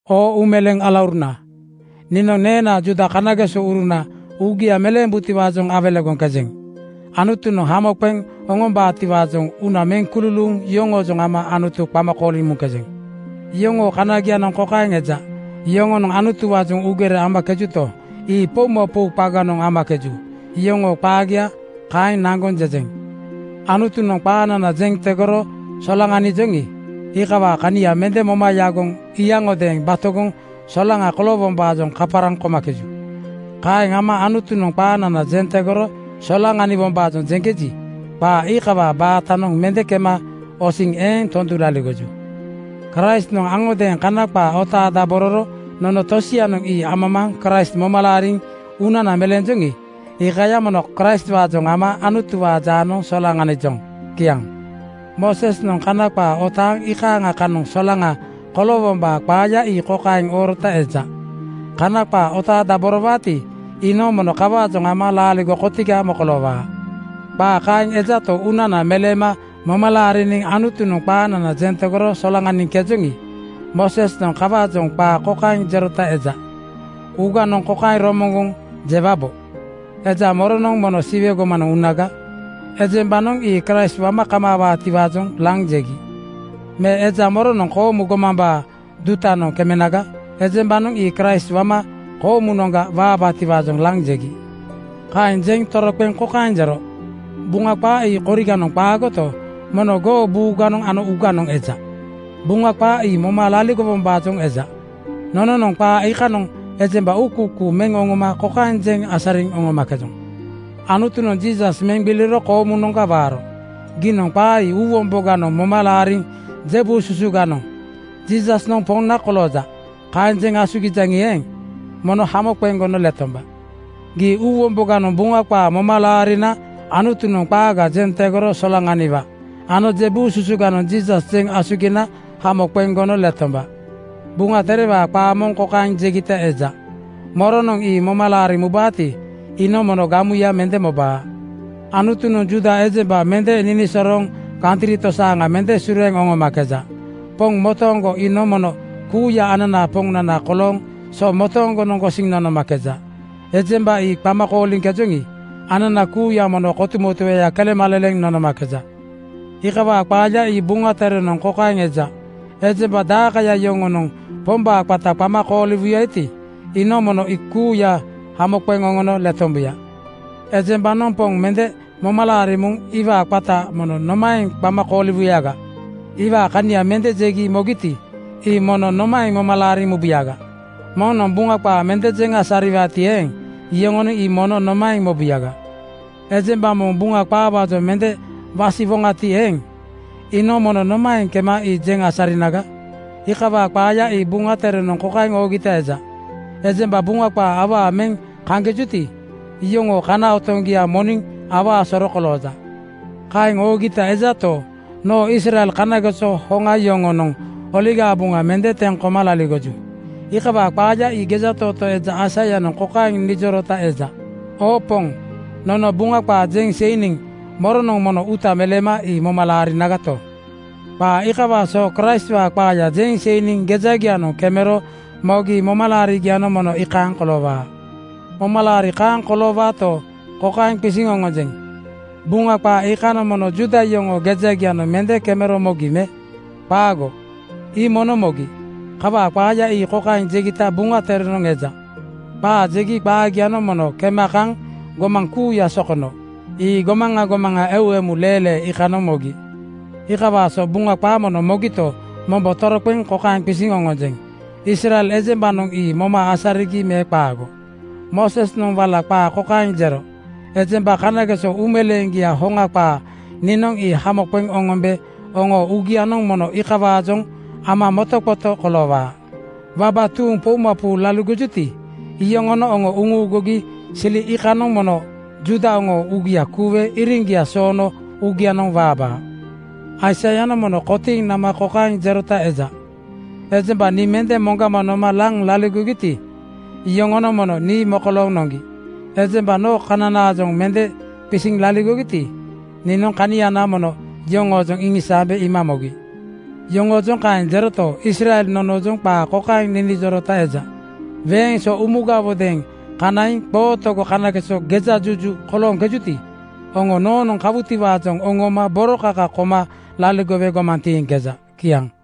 Oo uumeleeŋ alauruna, niinoŋ neenaa Juuda kanagesouruna uugia meleembutiwaajoŋ awelegoŋkejeŋ. Anutunoŋ hamo qeŋ oŋombaatiwaajoŋ uuna meŋ kululuuŋ yoŋoojoŋ ama Anutu qama kooliŋ muŋkejeŋ. Yoŋoo kanagianoŋ kokaeŋ eja: Yoŋonoŋ Anutuwaajoŋ uugere amakejuto, ii poumapou qaganoŋ amakeju. Yoŋoo qaagia kaeŋ naŋgoŋ jejeŋ. Anutunoŋ qaanana jeŋ tegoro solaŋanijoŋi, iikawaa kania mende moma yagoŋ iyaŋgiodeeŋ batogoŋ solaŋa koloowombaajoŋ kaparaŋ komakeju. Kaeŋ ama Anutunoŋ qaanana jeŋ tegoro solaŋaniwombaajoŋ jeŋkeji, qaa iikawaa baatanoŋ mende kema osiŋ eeŋ tondu laligoju. Kraistnoŋ aŋodeeŋ Kana qaa otaadabororo. Nono tosianoŋ ii amamaaŋ Kraist moma laariŋ uunana meleenjoŋi, iikaya mono Kraistwaajoŋ ama Anutuwaa jaanoŋ solaŋanijoŋ. Kiaŋ. Moosesnoŋ Kana qaa otaaŋ iikaaŋa kanoŋ solaŋa koloowombaa qaaya ii kokaeŋ oorota eja, “Kana qaa otaadaborowaati, iinoŋ mono kawaajoŋ ama laaligo kotiga mokoloowaa.” Qaa kaeŋ ejato, uunana meleema moma laariniŋ Anutunoŋ qaanana jeŋ tegoro solaŋaniŋkejoŋi, Moosesnoŋ kawaajoŋ qaa kokaeŋ jerota eja, “Uuganoŋ kokaeŋ romoŋgoŋ jewabo: Eja moronoŋ mono Siwe gomanoŋ unaga?” Ejembanoŋ ii Kraist wama kamaawaatiwaajoŋ laŋ jegi. Me “Eja moronoŋ koomu gomambaa dutanoŋ kemenaga?” Ejembanoŋ ii Kraist wama koomunoŋga waabaatiwaajoŋ laŋ jegi. Kaeŋ jeŋ toroqeŋ kokaeŋ jero, “Buŋa qaa ii koriganoŋ qaagoto, mono goo buuganoŋ ano uuganoŋ eja.” Buŋa qaa ii moma laariwombaajoŋ eja. Nononoŋ qaa iikanoŋ ejemba uukuukuu meŋ oŋoma kokaeŋ jeŋ asariŋ oŋomakejoŋ: Anutunoŋ Jiisas meŋ gbiliro koomunoŋga waaro. Giinoŋ qaa ii uuwomboganoŋ moma laariŋ je buu susuganoŋ “Jiisasnoŋ Poŋna kolooja,” kaeŋ jeŋ asugijaŋi eeŋ, mono hamo qeŋ gono letomba. Gii uuwomboganoŋ Buŋa qaa moma laarina Anutunoŋ qaaga jeŋ tegoro solaŋaniwa ano je buu susuganoŋ Jiisas jeŋ asugina hamo qeŋ gono letomba. Buŋa Terewaa qaa moŋ kokaeŋ jegita eja, “Moronoŋ ii moma laariŋ mubaati, iinoŋ mono gamuya mende mobaa.” Anutunoŋ Juuda ejemba mende ninisorooŋ kantri tosaaŋa mende sureeŋ oŋomakeja. Poŋ motooŋgo iinoŋ mono kuuya ananaa Poŋnana kolooŋ so motooŋgonoŋ gosiŋ nonomakeja. Ejemba ii qama kooliŋkejoŋi, anana kuuya mono kotumotueya kelemaleleŋ nonomakeja. Iikawaa qaaya ii Buŋa Terenoŋ kokaeŋ eja, “Ejemba dakaya yoŋonoŋ Pombaa qata qama kooliwuyati, iinoŋ mono ii kuuya hamo qeŋ oŋono letombuya.” Ejembanoŋ Poŋ mende moma laariŋ muŋ iwaa qata mono nomaeŋ qama kooliwuyaga? Iwaa kania mende jegi mogiti, ii mono nomaeŋ moma laariŋ mubuyaga? Moŋnoŋ Buŋa qaa mende jeŋ asariwaati eeŋ, yoŋonoŋ ii mono nomaeŋ mobuyaga? Ejemba moŋ Buŋa qaawaajoŋ mende wasiwoŋati eeŋ, iinoŋ mono nomaeŋ kema ii jeŋ asarinaga? Iikawaa qaaya ii Buŋa Terenoŋ kokaeŋ oogita eja, “Ejemba Buŋa qaa awaa meŋ kaŋkejuti, iyoŋoo kana otoŋgia moniŋ awaa soro kolooja.” Kaeŋ oogita ejato, noo Israel kanageso hoŋa yoŋonoŋ Oligaa Buŋa mende teŋ koma laligoju. Iikawaa qaaya ii gejatootoo eja Aisaianoŋ kokaeŋ ninijorota eja, “Oo Poŋ, nono Buŋa qaa jeŋ seiniŋ moronoŋ mono uuta meleema ii moma laarinagato?” Qaa iikawaa so Kraistwaa qaaya jeŋ seiniŋ gejagianoŋ kemero mogi momalaarigianoŋ mono iikaaŋ koloowaa. Momalaari kaaŋ koloowaato, kokaeŋ qisiŋ oŋonjeŋ: Buŋa qaa iikanoŋ mono Juuda yoŋoo gejagianoŋ mende kemero mogi me? Qaago, ii mono mogi. Kawaa qaaya ii kokaeŋ jegita Buŋa Terenoŋ eja, “Qaa jegi qaagianoŋ mono kema kaŋ gomaŋ kuuya sokono. Ii gomaŋa gomaŋa eu emu leelee iikanoŋ mogi.” Qaa iikawaa so Buŋa qaa mono mogito, mombo toroqeŋ kokaeŋ qisiŋ oŋonjeŋ: Israel ejembanoŋ ii moma asarigi me qaago? Moosesnoŋ wala qaa kokaeŋ jero, “Ejemba kanageso uumeleeŋgiaa hoŋa qaa niinoŋ ii hamo qeŋ oŋombe oŋoo uugianoŋ mono iikawaajoŋ ama motoqoto koloowaa. Waba tuuŋ poumapou laligojuti, iyoŋonoŋ oŋo uŋuugugi sili iikanoŋ mono Juuda oŋoo uugia kuuwe iriŋgia soono uugianoŋ waabaa.” Aisaianoŋ mono kotiiŋ nama kokaeŋ jerota eja, “Ejemba nii mende moŋgama noma laŋ laligogiti, iyoŋonoŋ mono nii mokolooŋ noŋgi. Ejemba noo kananaajoŋ mende qisiŋ laligogiti, niinoŋ kaniana mono yoŋoojoŋ iŋisaambe iima mogi.” Yoŋoojoŋ kaeŋ jeroto, Israel nonoojoŋ qaa kokaeŋ ninijorota eja, “Weeŋ so umugawodeeŋ kanaiŋ qootogo kanageso gejajuju kolooŋkejuti, oŋo noonoŋ kawutiwaajoŋ oŋooma boro kaka koma laligowe gomaŋ tiiŋkeja.” Kiaŋ.